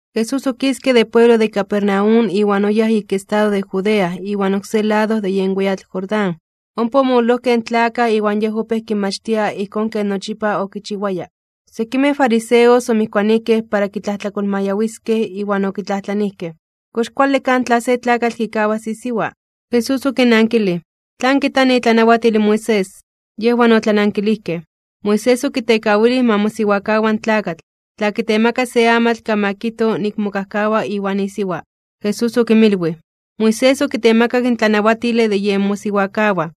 Jesús okiske de pueblo de Capernaum iwan oyáj ik estado de Judea iwan oksé lado de yen weyatl Jordán, ompa omololojkej in tlakaj iwan Yej opéj kinmachtia ijkón ken nochipa okichiwaya. Sekimej fariseos omijkuanijkej para kitlajtlakolmayawiskej iwan okitlajtlanijkej: ―¿Kox kuale kaj tla se tlakatl kikawas isiwa? Jesús okinnankilij: ―¿Tlan kijta itlanawatil in Moisés? Yejwan otlanankilijkej: ―Moisés okitekawilij ma mosiwakawa in tlakatl, tla kitemaka se amatl kan ma kijto nik mokajkawa iwan isiwa. Jesús okinmilwij: ―Moisés okitemakak in tlanawatile de yen mosiwakawaj,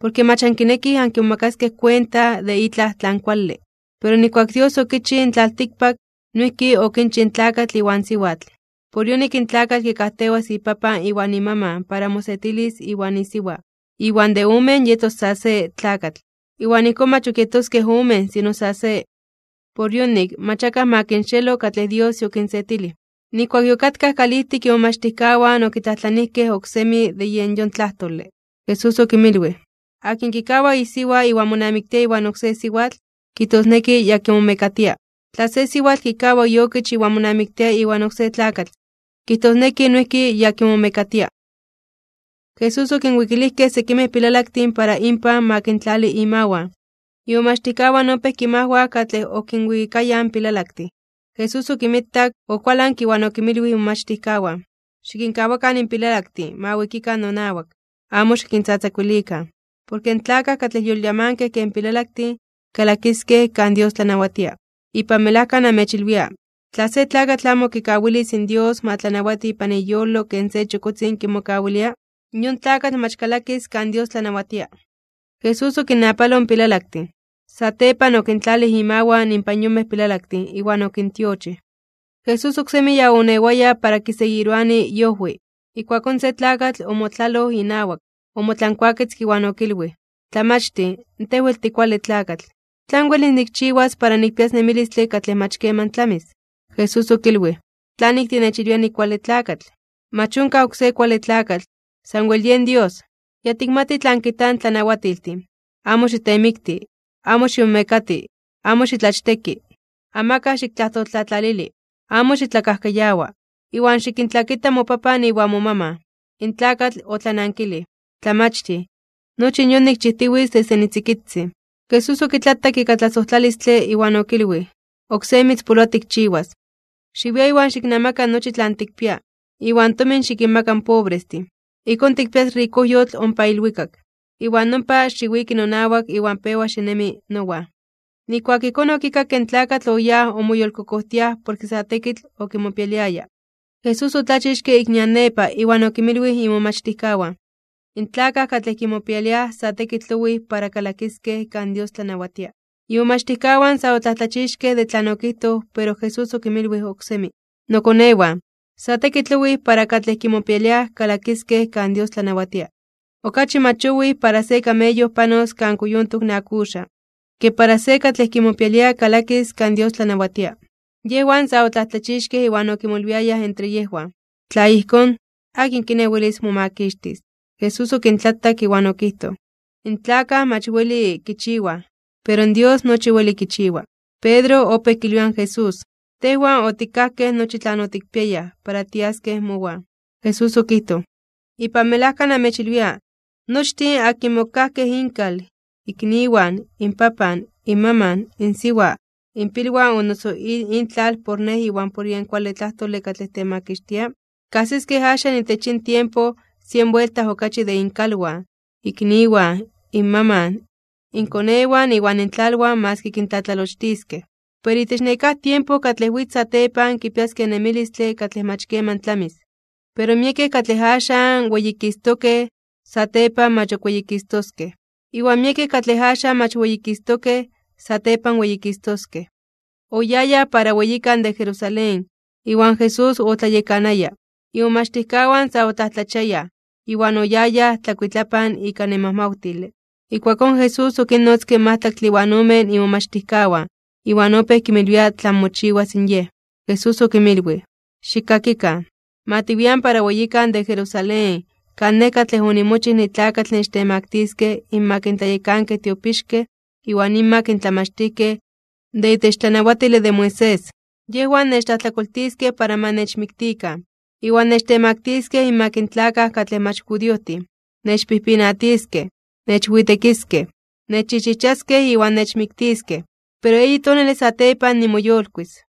porke mach ankinekij ankimomakaskej kuenta de itlaj tlan kuale. Pero nijkuak Dios okichij in tlaltikpak, noijki okichij in tlakatl iwan siwatl. Por yonik in tlakatl kikajtewas ipapan iwan imaman para mosetilis iwan isiwa. Iwan de omen yetos sa se tlakatl. Iwan ijkón mach ok yetoskej omen sino sa se. Por yonik, mach akaj ma kinxeelo katlej Dios yokinsetilij. Nijkuak yokatkaj kalijtik imomachtijkawan okitlajtlanijkej oksemi de yen yon tlajtole. Jesús okinmilwij: ―Akin kikawa isiwa iwan monamiktia iwan oksé siwatl, kijtosneki ya kimomekatia. Tla se siwatl kikawa iokich iwan monamiktia iwan oksé tlakatl, kijtosneki noijki ya kimomekatia. Jesús okinwikilijkej sekimej pilalaktin para inpan ma kintlali imawan. Imomachtijkawan opéj kinmajwaj katlej okinwikayaj in pilalaktin. Jesús okinmitak, okualanke iwan okinmilwij imomachtijkawan: ―Xikinkawakan in pilalaktin ma wikikan nonawak, amo xikintzatzakuilikan. Porke in tlakaj katlej yolyamankej ken pilalaktin, kalakiskej kan Dios tlanawatia. Ipan melajka namechilwia, tla se tlakatl amo kikawilis in Dios ma tlanawati ipan iyolo ken se chokotzin kimokawilia, yon tlakatl mach kalakis kan Dios tlanawatia. Jesús okinnapaloj in pilalaktin, satepan okintlalij imawan inpan yonmej pilalaktin iwan okintiochij. Jesús oksemi ya oonewaya para kiseguiroani iojwi, ijkuakón se tlakatl omotlaloj inawak, omotlankuaketzke iwan okilwij: ―Tlamachtij, Tej wel tikuale tlakatl. ¿Tlan welis nikchiwas para nikpias nemilistle katlej mach keman tlamis? Jesús okilwij: ―¿Tlanik tinechilwia nikuale tlakatl? Mach onkaj oksé kuale tlakatl, sanwel yen Dios. Ya tikmati tlan kijtaj in tlanawatiltin: “Amo xitemikti, amo ximomekati, amo xitlachteki, amakaj xiktlajtoltlatlalili, amo xitlakajkayawa, iwan xikintlakita mopapan iwan momaman.” In tlakatl otlanankilij: ―Tlamachtij, nochi in yon nikchijtiwitz desde nitzikitzin. Jesús okitlatak ika tlasojtlalistle iwan okilwij: ―Oksé mitzpoloa tikchiwas. Xiwia iwan xiknamaka nochi tlan tikpia, iwan tomin xikinmaka in pobrestin. Ijkón tikpias rikojyotl ompa ilwikak. Iwan nompa, xiwiki nonawak iwan pewa xinemi nowan. Nijkuak ijkón okikakke in tlakatl oyáj omoyolkokojtiaj porke sa tekitl okimopialiaya. Jesús otlachixke ik nian nepa iwan okinmilwij imomachtijkawan: ―In tlakaj katlej kimopialiaj sa tekitl owij para kalakiskej kan Dios tlanawatia. Imomachtijkawan sa otlajtlachixkej (omomajmawtijkej) de tlan okijtoj pero Jesús okinmilwij oksemi: ―Nokonewan, sa tekitl owij para katlej kimopialiaj kalakiskej kan Dios tlanawatia. Okachi mach owij para se kameyo panos kan kuyontok in akuxaj, ke para se katlej kimopialia kalakis kan Dios tlanawatia. Yejwan sa otlajtlachixkej (omomajmawtijkej) iwan okimolwiayaj entre yejwan: ―Tla ijkón, ¿akin kiné welis momakixtis? Jesús okintlatak iwan okijtoj: ―In tlakaj mach weli kichiwaj, pero Dios nochi weli kichiwa. Pedro opéj kilwia in Jesús: ―Tejwan otikajkej nochi tlan otikpiayaj para tiaskej mowan. Jesús okijtoj: ―Ipan melajka namechilwia, nochtin akinmej okikajkej inkal, ikniwan, inpapan, inmaman, insiwa, inpilwan o noso intlal por Nej iwan por yen kuale tlajtole katlej temakixtia, kajsiskej axan itech yin tiempo sien buelta okachi de inkalwan, ikniwan, inmaman, inkonewan iwan intlalwan maski kintlatlalochtiskej. Pero itech nekáj tiempo katlej witz satepan kipiaskej in nemilistle katlej mach keman tlamis. Pero miekej katlej axan weyikistokej (weyititokej), satepan mach ok weyikistoskej. Iwan miekej katlej axan mach weyikistokej, satepan weyikistoskej. Oyayaj para weyikan de Jerusalén, iwan Jesús otlayekanaya. Imomachtijkawan sa otlajtlachiayaj (omomajmawtiayaj) iwan oyayaj tlakuitlapan ika nemajmawtile. Ijkuakón Jesús okinnotzke in majtlaktle iwan omen imomachtijkawan, iwan opéj kinmilwia tlan mochiwas in Yej. Jesús okinmilwij: ―Xikkakikan. Ma tiwian para weyikan de Jerusalén kan Nej katlej onimochij nitlakatl nechtemaktiskej (nechtemaktiliskej) inmak in tlayekankej tiopixkej iwan inmak in tlamachtijkej de itech tlanawatile de Moisés. Yejwan nechtlajtlakoltiskej para ma nechmiktikan, iwan nechtemaktiskej inmak in tlakaj katlej mach judiojtin. Nechpijpinatiskej, nechwitekiskej, nechchijchijchaskej iwan nechmiktiskej, pero eyi tonale satepan nimoyolkuis (nimoyolitis).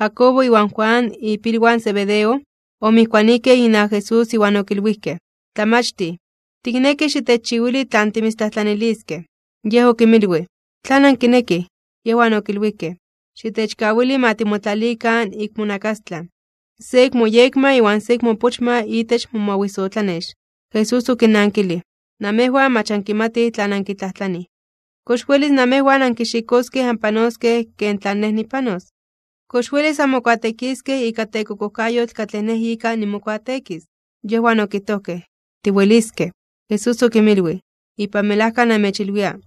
Jacobo iwan Juan, ipilwan Zebedeo, omijkuanijkej inawak Jesús iwan okilwijkej: ―Tlamachtij, tiknekij xitechchiwili tlan timitztlajtlaniliskej. Yej okinmilwij: ―¿Tlan ankinekij? Yejwan okilwijkej: ―Xitechkawili ma timotlalikan ik monakastlan, se ik moyekma iwan se ik moopochma itech momawisotlanex. Jesús okinnankilij: ―Namejwan mach ankimatij tlan ankitlajtlanij. ¿Kox welis namejwan ankixikoskej anpanoskej ken tlan Nej nipanos? ¿Kox welis anmokuateekiskej ika tekokojkayotl katlej Nej ika nimokuateekis? Yejwan okijtojkej: ―Tiweliskej. Jesús okinmilwij: ―Ipan melajka namechilwia,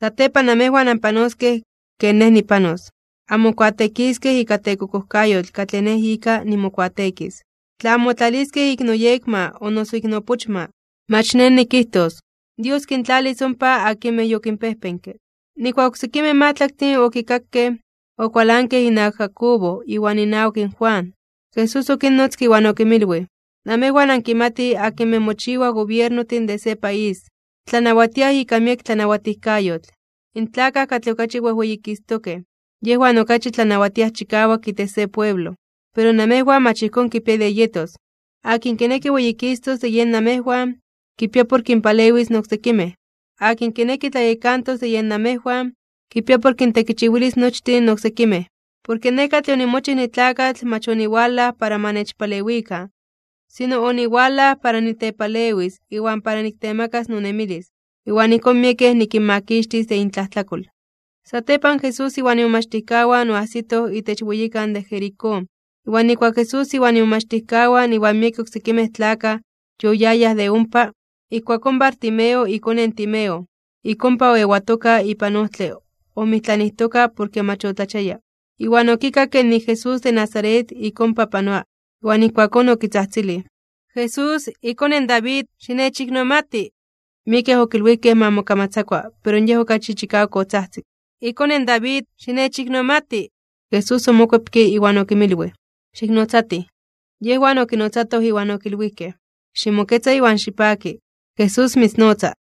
satepan namejwan anpanoskej ken Nej nipanos, anmokuateekiskej ika tekokojkayotl katlej Nej ika nimokuateekis. Tla anmotlaliskej ik noyekma o noso ik noopochma, mach Nej nikijtos. Dios kintlalis ompa akinmej yokinpejpenke. Nijkuak in oksekimej majtlaktin okikakej, okualankej inawak Jacobo iwan inawak Juan. Jesús okinnotzke iwan okinmilwij: ―Namejwan ankimatij akinmej mochiwaj gobiernojtin de se país, tlanawatiaj ika miek tlanawatijkayotl. In tlakaj katlej okachi wejweyikistokej (wejweyititokej), yejwan okachi tlanawatiaj chikawak itech se pueblo. Pero namejwan mach ijkón kipia de yetos, akin kineki weyikistos de yen namejwan, kipia por kinpalewis in oksekimej. Akin kineki tlayekantos de yej namejwan, kipia por kintekichiwilis nochtin in oksekimej. Porke Nej katlej onimochij nitlakatl mach oniwalaj para ma nechpalewikan, sino oniwalaj para nitepalewis iwan para niktemakas nonemilis, iwan ijkón miekej nikinmakixtis de intlajtlakol. Satepan Jesús iwan imomachtijkawan oajsitoj itech weyikan de Jericó. Iwan nijkuak Jesús iwan imomachtijkawan iwan miekej oksekimej tlakaj yoyayaj de ompa, ijkuakón Bartimeo ikone in Timeo, ik ompa oewatoka ipan ojtle omijtlanijtoka porke mach otlachiaya. Iwan okikakke nik in Jesús de Nazaret ik ompa panoa, iwan ijkuakón okitzajtzilij: ―¡Jesús, iKone in David, xinechiknomati! Miekej okilwijkej ma mokamatzakua pero yej okachi chikawak otzajtzik: ―¡IKone in David, xinechiknomati! Jesús omokuepke iwan okinmilwij: ―¡Xiknotzatij! Yejwan okinotzatoj iwan okilwijkej: ―¡Ximoketza iwan xipaki, Jesús mitznotza!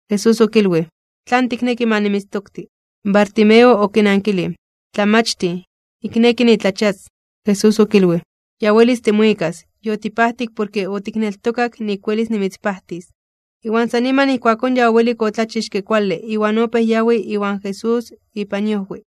Jesús okilwij: ―¿Tlan tikneki ma nimitztokti? Bartimeo okinankilij: ―Tlamachtij, nikneki nitlachias. Jesús okilwij: ―Ya welis timuikas. Yotipajtik porke otikneltokak nik welis nimitzpajtis. Iwan san niman ijkuakón ya owelik otlachixke kuale iwan opéj yawi iwan Jesús ipan iojwi.